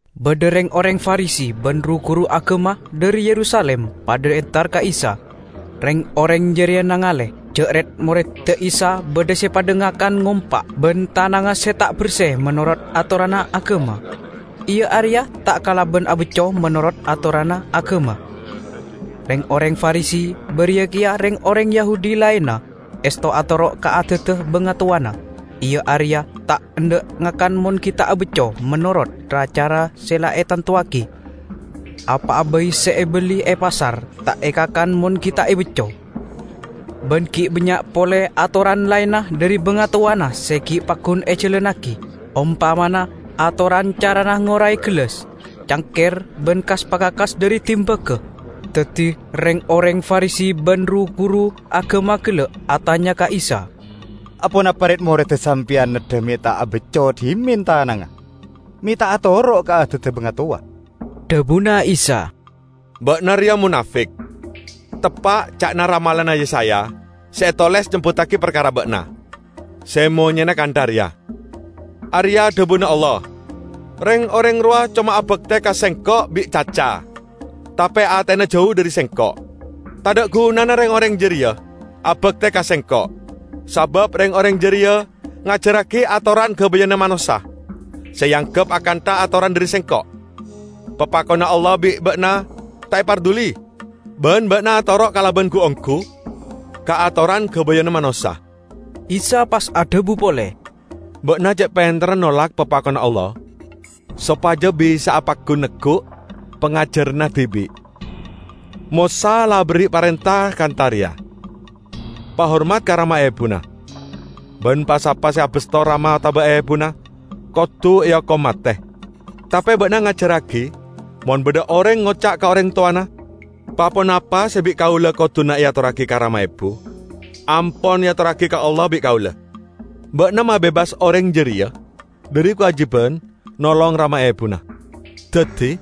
Badha reng-oreng Farisi ban ru-guru agama dhari Yerusalim padha entar ka Isa. Reng-oreng jareya nangale ja' red-moredda Isa badha se padha ngakan ngompa' ban tanangnga se ta' berse menorot atoranna agama, iya areya ta' kalaban abacco menorot atoranna agama. Reng-oreng Farisi, bariya keya reng-oreng Yahudi laenna, esto atoro' ka adadda bangatowana: iya areya ta' endha' ngakan mon gi' ta' abacco menorot ra-cara se la etantowagi. Apa'a bai se ebelli e pasar ta' ekakan mon gi' ta' ebacco. Ban gi' bannya' pole atoran laenna dhari bangatowana se gi' paggun ejalannagi; ompamana atoran carana ngorae gellas, cangker ban kas-pakakas dhari dimbaga. Daddi reng-oreng Farisi ban ru-guru agama gella' atanya ka Isa, "Aponapa red-moredda sampeyan neddha me' ta' abacco dhimen tanangnga? Me' ta' atoro' ka adadda bangatowa?" Dhabuna Isa, "Ba'na reya monafik! Teppa' ca'na ramalanna Yesaya se etoles nyebbuttagi parkara ba'na, se monyena kantha reya, 'Areya' dhabuna Allah, Reng-oreng rowa coma abakte ka Sengko' bi' caca, tape atena jau dhari Sengko'. Tadha' gunana reng-oreng jareya abakte ka Sengko', sabab reng-oreng jareya ngajarragi atoran gabayanna manossa se eanggep akantha atoran dhari Sengko'!' Papakonna Allah bi' ba'na ta' eparduli, ban ba'na atoro' kalaban gu-onggu ka atoran gabayanna manossa." Isa pas adhabu pole, "Ba'na ce' penterra nolak papakonna Allah sopaja bisa'a paggun neggu' pangajaranna dibi'. Mosa la aberri' parenta kantha reya, 'Pahormat ka rama ebuna,' ban 'Pa-sapa se abasto rama otaba ebuna kodu eokom mate.' Tape ba'na ngajarragi: Mon badha oreng ngoca' ka oreng towana, 'Pa-ponapa se bi' kaula koduna eatorragi ka rama ebu, ampon eatorragi ka Allah bi' kaula,' ba'na mabebas oreng jareya dhari kawajiban nolong rama ebuna. Daddi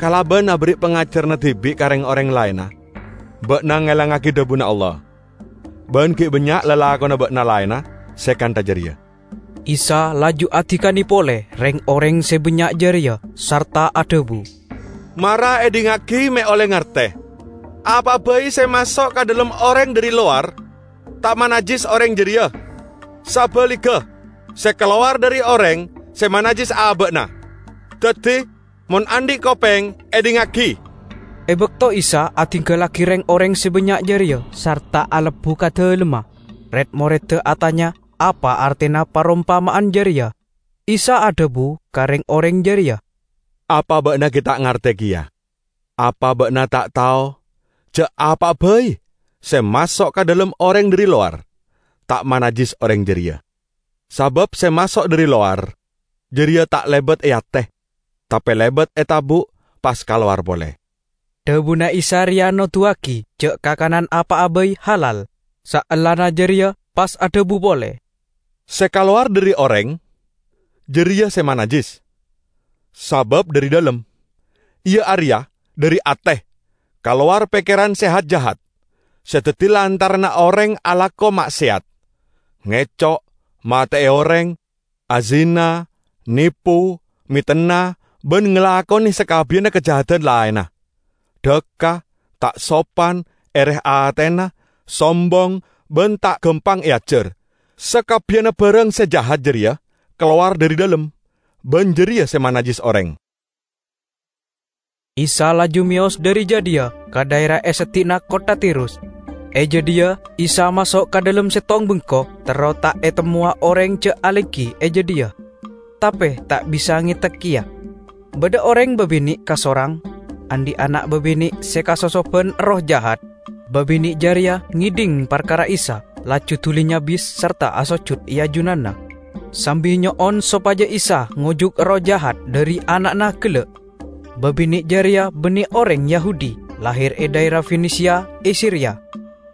kalaban aberri' pangajaranna dibi' ka reng-oreng laenna, ba'na ngelangngagi dhabuna Allah. Ban gi' bannya' lalakonna ba'na laenna se kantha jareya." Isa laju adikane pole reng-oreng se bannya' jareya sarta adhabu, "Mara edhingngagi me' olle ngarte! Apa'a bai se maso' ka dhalem oreng dhari lowar ta' manajjis oreng jareya. Sabaligga, se kalowar dhari oreng se manajjis aba'na. [ Daddi, mon andhi', kopeng, edhingngagi!]" E bakto Isa adinggallagi reng-oreng se bannya' jareya sarta alebbu ka dalemma, red-moredda atanya apa artena parompama'an jareya. Isa adhabu ka reng-oreng jareya, "Apa ba'na gi' ta' ngarte keya? Apa ba'na ta' tao ja' apa'a bai se maso' ka dhalem oreng dhari lowar ta' manajjis oreng jareya? Sabab se maso' dhari lowar jareya ta' lebat e ate, tape lebat e tabu' pas kalowar pole." Dhabuna Isa reya noduwagi ja' kakanan apa'a bai halal. Saellana jareya pas adhabu pole, "Se kalowar dhari oreng, jareya se manajjis. Sabab dhari dhalem, iya areya dhari ate, kalowar pekkeran se hat-jahat se daddi lantaranna oreng alako ma'seyat, ngeco', mate'e oreng, azina, nepo, metenna ban ngalakone sakabbiyanna kajahadan laenna, dhakka, ta' sopan, ere atena, sombong ban ta' gampang eajar. Sakabbiyanna barang se jahat jareya kalowar dhari dhalem, ban jareya se manajjis oreng." Isa laju meyos dhari jadhiya ka dhaera e seddi'na kottha Tirus. E jadhiya Isa maso' ka dhalem settong bengko terro ta' etemmowa oreng ja' alenggi e jadhiya. Tape ta' bisa ngetek keya. Badha oreng babine' kasorang, andhi' ana' babine' se kasosoban erroh jahat; babine' jareya ngedhing parkara Isa, laju duli nyabis sarta asojud e ajunanna, sambi nyo'on sopaja Isa ngojuk erroh jahat dhari ana'na gella'. Babine' jareya banne oreng Yahudi, lahir e dhaera Fenisia e Siria.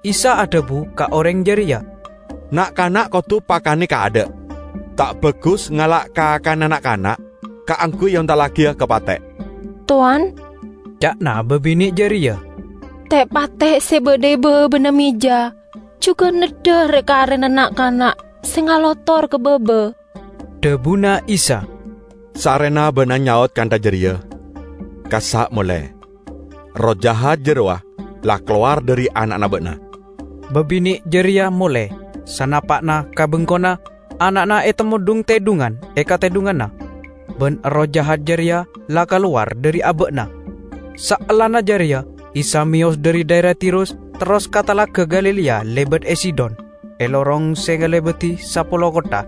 Isa adhabu ka oreng jareya, "Na'-kana' kodu pakane kaadha'. Ta' bagus ngala' kakanna na'-kana' kaangguy eontallagiya ka pate'." "Towan," ca'na babine' jareya, "te'-pate' se badha e babana meja jugan neddha re-karena na'-kana' se ngalotor ka baba." Dhabuna Isa, "Sarrena ba'na nyaot kantha jareya, kassa' mole; erroh jahat jarowa la kalowar dhari ana'na ba'na." Babine' jareya mole. Sanapa'na ka bengkona, ana'na etemmo dhung-tedhungan e katedhunganna, ban erroh jahat jareya la kalowar dhari aba'na. Saellana jareya Isa meyos dhari dhaera Tirus terros ka Talaga Galilea lebat e Sidon, e lorong se ngalebadi Sapolo Kottha.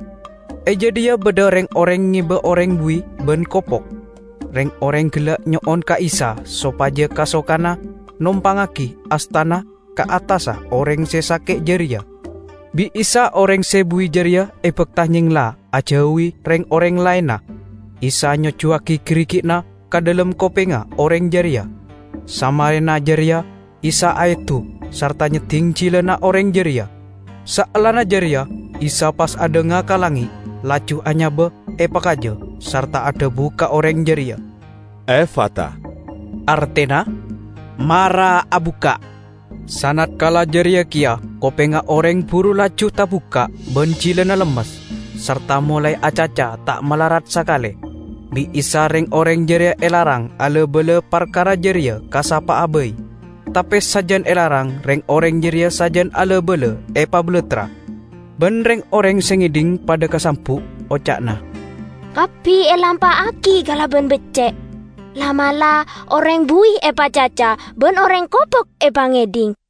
E jadhiya badha reng-oreng ngeba oreng buwi ban kopok. Reng-oreng gella' nyo'on ka Isa sopaja kasokana nompangngagi astana ka attassa oreng se sake' jareya. Bi' Isa oreng se buwi jareya ebakta nyengla ajauwi reng-oreng laenna; Isa nyojjuwagi garigi'na ka dhalem kopengnga oreng jareya. Samarena jareya Isa aedu sarta nyedding jilana oreng jareya. Saellana jareya Isa pas adhanga ka langnge', laju anyaba epakaja sarta adhabu ka oreng jareya, "Efata," artena "Mara abukka'!" Sanatkala jareya keya kopengnga oreng buru laju tabukka' ban jilana lemmes, sarta molae acaca ta' malarat sakale. Bi' Isa reng-oreng jareya elarang ala-bala parkara jareya ka sapa'a bai. Tape sajan elarang reng-oreng jareya sajan ala-bala epabalattra. Ban reng-oreng se ngedhing padha kasambu'. Oca'na, "Kabbi elampa'agi kalaban becce'! La'-mala' oreng buwi epacaca ban oreng kopok epangedhing!"